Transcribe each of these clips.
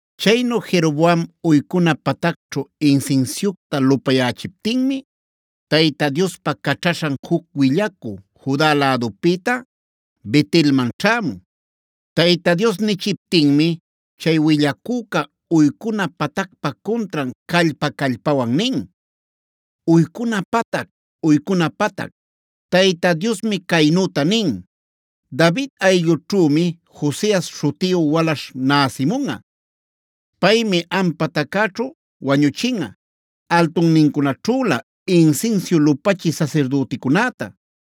Chaynu Jeroboam uycuna patacćhu insinsiucta lupayächiptinmi Tayta Diospa caćhaśhan juc willacü Juda lädupïta Bet-elman ćhämun. Tayta Dios nichiptinmi chay willacüca uycuna patacpa cuntran callpa-callpawan nin: “Uycuna patac, uycuna patac, Tayta Diosmi caynüta nin: ‘David ayllućhümi Josias śhutiyu walaśh näsimunꞌa. Paymi am pataccäćhu wañuchinꞌa altunnincunaćhülä insinsiu lupachï sasirdüticunäta.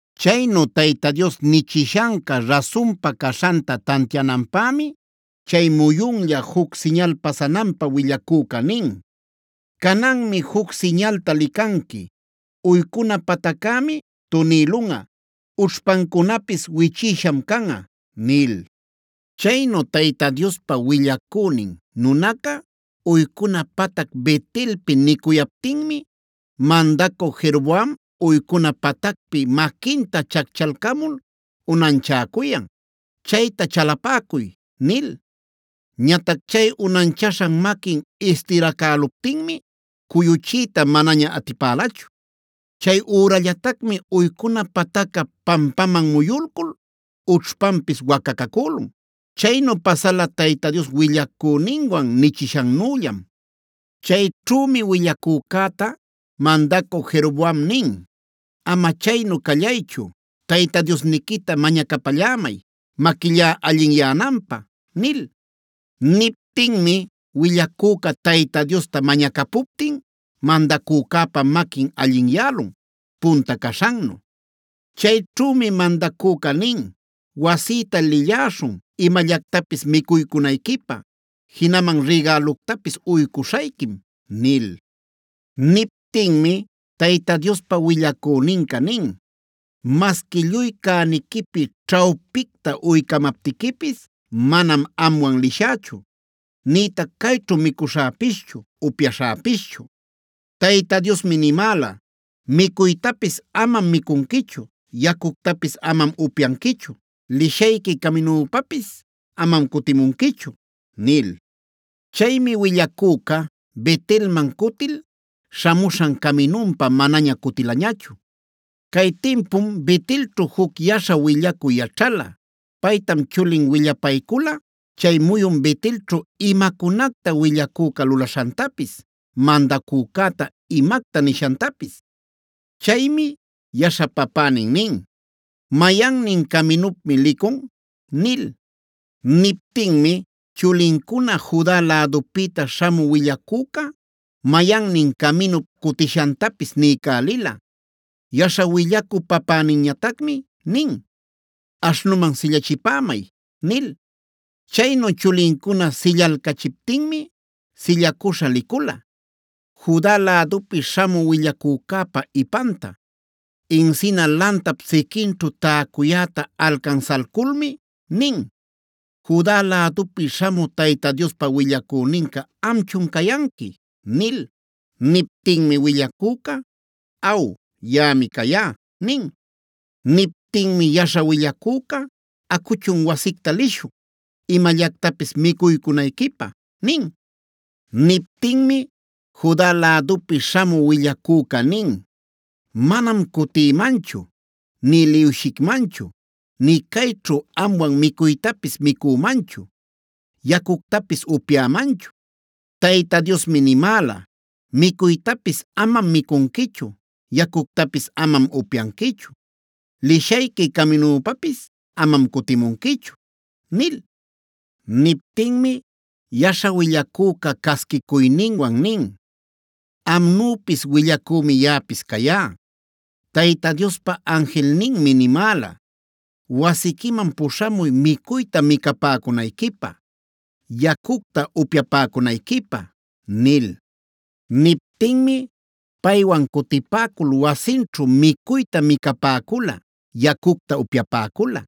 Chaynu Tayta Dios nichishanca rasunpa caśhanta tantiananpämi chay muyunlla juc siñal pasananpä willacüca nin: “Cananmi juc siñalta licanqui: uycuna pataccämi tunïlunꞌa; ućhpancunapis wichïsham canꞌa” nil. Chaynu Tayta Diospa willacünin nunaca uycuna patac Bet-elpi nicuyaptinmi mandacü Jeroboam uycuna patacpi maquinta chacchalcamul unanchäcuyan: “¡Chayta chalapäcuy!” nil. Ñatac chay unanchaśhan maquin istiracäluptinmi cuyuchiyta manaña atipälachu. Chay ürallatacmi uycuna patacca pampaman muyulcul ućhpanpis wacacacülun. Chaynu pasala Tayta Dios willacüninwan nichishannüllam. Chayćhümi willacücäta mandacü Jeroboam nin: “Ama chaynu callaychu, Tayta Diosniquita mañacapallämay maquillá allinyänanpä” nil. Niptinmi willacüca Tayta Diosta mañacapuptin mandacücäpa maquin allinyälun, punta caśhannu. Chayćhümi mandacüca nin: “Wasïta lilläśhun imallactapis micuycunayquipä; jinaman rigäluctapis uycuśhayquim” nil. Niptinmi Tayta Diospa willacüninca nin: “Masqui lluy cäniquipi ćhawpicta uycamaptiquipis manam amwan lishächu, nïtac cayćhu micuśhäpischu, upyaśhäpischu. Tayta Diosmi nimäla: ‘Micuytapis amam micunquichu, yacuctapis amam upyanquichu, lishayqui caminüpapis amam cutimunquichu’” nil. Chaymi willacüca Bet-elman cutil śhamuśhan caminunpa manaña cutilañachu. Cay timpum Bet-elćhu juc yaśha willacü yaćhala. Paytam chulin willapaycula chay muyun Bet-elćhu imacunacta willacüca lulaśhantapis, mandacücäta imacta nishantapis. Chaymi yaśha papänin nin: “¿Mayannin caminupmi licun?” nil. Niptinmi chulincuna Juda lädupïta śhamü willacüca mayannin caminup cutishantapis niycälila. Yaśha willacü papäninñatacmi nin: “Aśhnuman sillachipämay” nil. Chaynu chulincuna sillalcachiptinmi sillacuśha licula, Juda lädupi śhamü willacücäpa ipanta. Encina lantap siquinćhu täcuyäta alcansalculmi nin: “¿Juda lädupi śhamü Tayta Diospa willacüninca amchun cayanqui?” nil. Niptinmi willacüca: “Aw, yaꞌami cayá” nin. Niptinmi yaśha willacüca: “Acuchun wasicta lishun, imallactapis micuycunayquipä” nin. Niptinmi Juda lädupi śhamü willacüca nin: “Manam cutïmanchu, nï liwshicmanchu, nï cayćhu amwan micuytapis micümanchu, yacuctapis upyämanchu. Tayta Diosmi nimäla: ‘Micuytapis amam micunquichu, yacuctapis amam upyanquichu, lishayqui caminüpapis amam cutimunquichu’” nil. Niptinmi yaśha willacüca casquicuyninwan nin: “Amnüpis willacümi yaꞌapis cayá. Tayta Diospa anjilninmi nimäla: ‘Wasiquiman puśhamuy micuyta micapäcunayquipä, yacucta upyapäcunayquipä’” nil. Niptinmi paywan cutipäcul wasinćhu micuyta micapäcula, yacucta upyapäcula.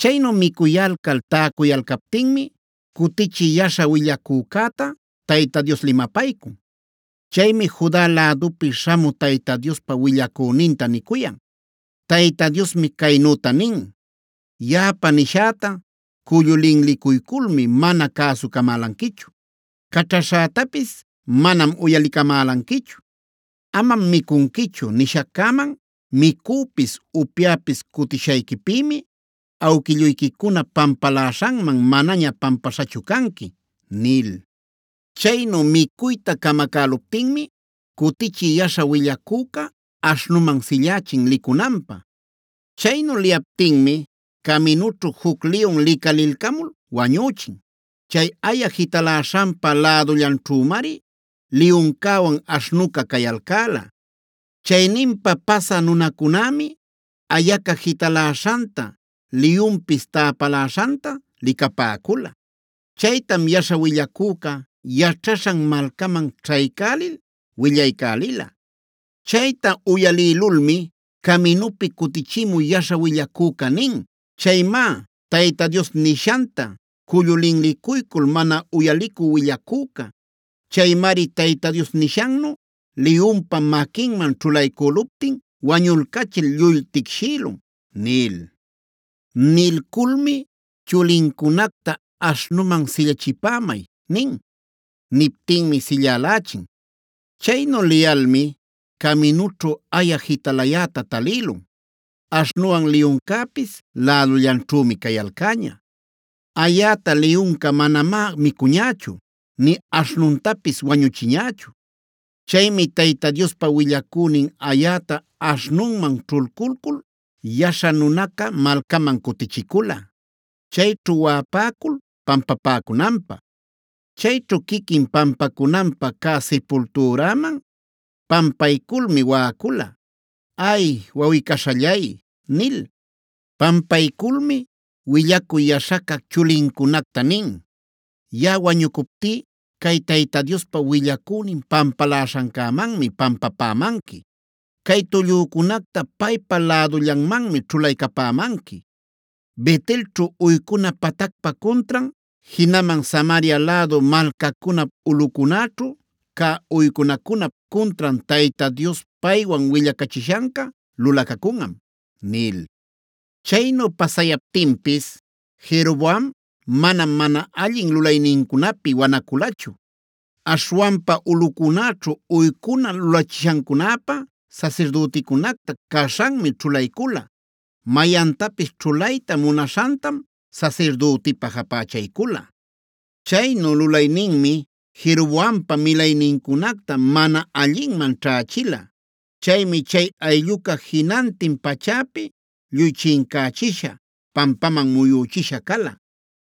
Chaynu micuyalcal täcuyalcaptinmi cutichï yaśha willacücäta Tayta Dios limapaycun. Chaymi Juda lädupi śhamü Tayta Diospa willacüninta nicuyan: “Tayta Diosmi caynüta nin: ‘Yaꞌapa nishäta cullu linlicuyculmi mana cäsucamälanquichu; caćhaśhätapis manam uyalicamälanquichu. Amam micunquichu nishaccäman micüpis, upyäpis cutishayquipïmi awquilluyquicunap pampaläśhanman manaña pampaśhachu canqui’” nil. Chaynu micuyta camacäluptinmi cutichï yaśha willacüca aśhnuman sillächin licunanpä. Chaynu liyaptinmi caminućhu juc liyun licalilcamul wañüchin. Chay aya jitaläśhanpa lädullanćhümari liyuncäwan aśhnuca cayalcäla. Chayninpa pasä nunacunämi ayaca jitaläśhanta, liyunpis täpaläśhanta licapäcula. Chaytam yaśha willacüca yaćhaśhan malcaman ćhaycälil willaycälila. Chayta uyalïlulmi caminupi cutichimü yaśha willacüca nin: “Chaymá Tayta Dios nishanta cullu linlicuycul mana uyalicü willacüca. Chaymari Tayta Dios nishannu liyunpa maquinman ćhulaycüluptin wañulcachil lluy ticshïlun” nil. Nilculmi chulincunacta: “Aśhnuman sillachipämay” nin. Niptinmi sillälächin. Chaynu liyalmi caminućhu aya jitalayäta talïlun; aśhnuwan liyuncäpis lädullanćhümi cayalcäña. Ayäta liyunca manamá micuñächu, nï aśhnuntapis wañuchiñächu. Chaymi Tayta Diospa willacünin ayäta aśhnunman ćhulculcul yaśha nunaca malcaman cutichicula, chayćhu waꞌapäcul pampapäcunanpä. Chayćhu quiquin pampacunanpä cä sipultüraman pampayculmi waꞌacula: “Ay, wawꞌi-caśhallay” nil. Pampayculmi willacü yaśhaca chulincunacta nin: “Yaꞌa wañucuptí cay Tayta Diospa willacünin pampaläśhancämanmi pampapämanqui. Cay tullücunacta paypa lädullanmanmi ćhulaycapämanqui. Bet-elćhu uycuna patacpa cuntran, jinaman Samaria lädu malcacunap ulꞌucunäćhu cä uycunacunap cuntran Tayta Dios paywan willacachishanca lulacacunꞌam” nil. Chaynu pasayaptinpis Jeroboam manam mana allin lulaynincunapi wanaculachu. Aśhwanpa ulꞌucunäćhu uycuna lulachishancunäpä sasirdüticunacta caśhanmi ćhulaycula. Mayantapis ćhulayta munaśhantam sasirdütipa japächaycula. Chaynu lulayninmi Jeroboampa milaynincunacta mana allinman ćhächila. Chaymi chay aylluca jinantin pachäpi lluy chincächisha, pampaman muyüchisha cala.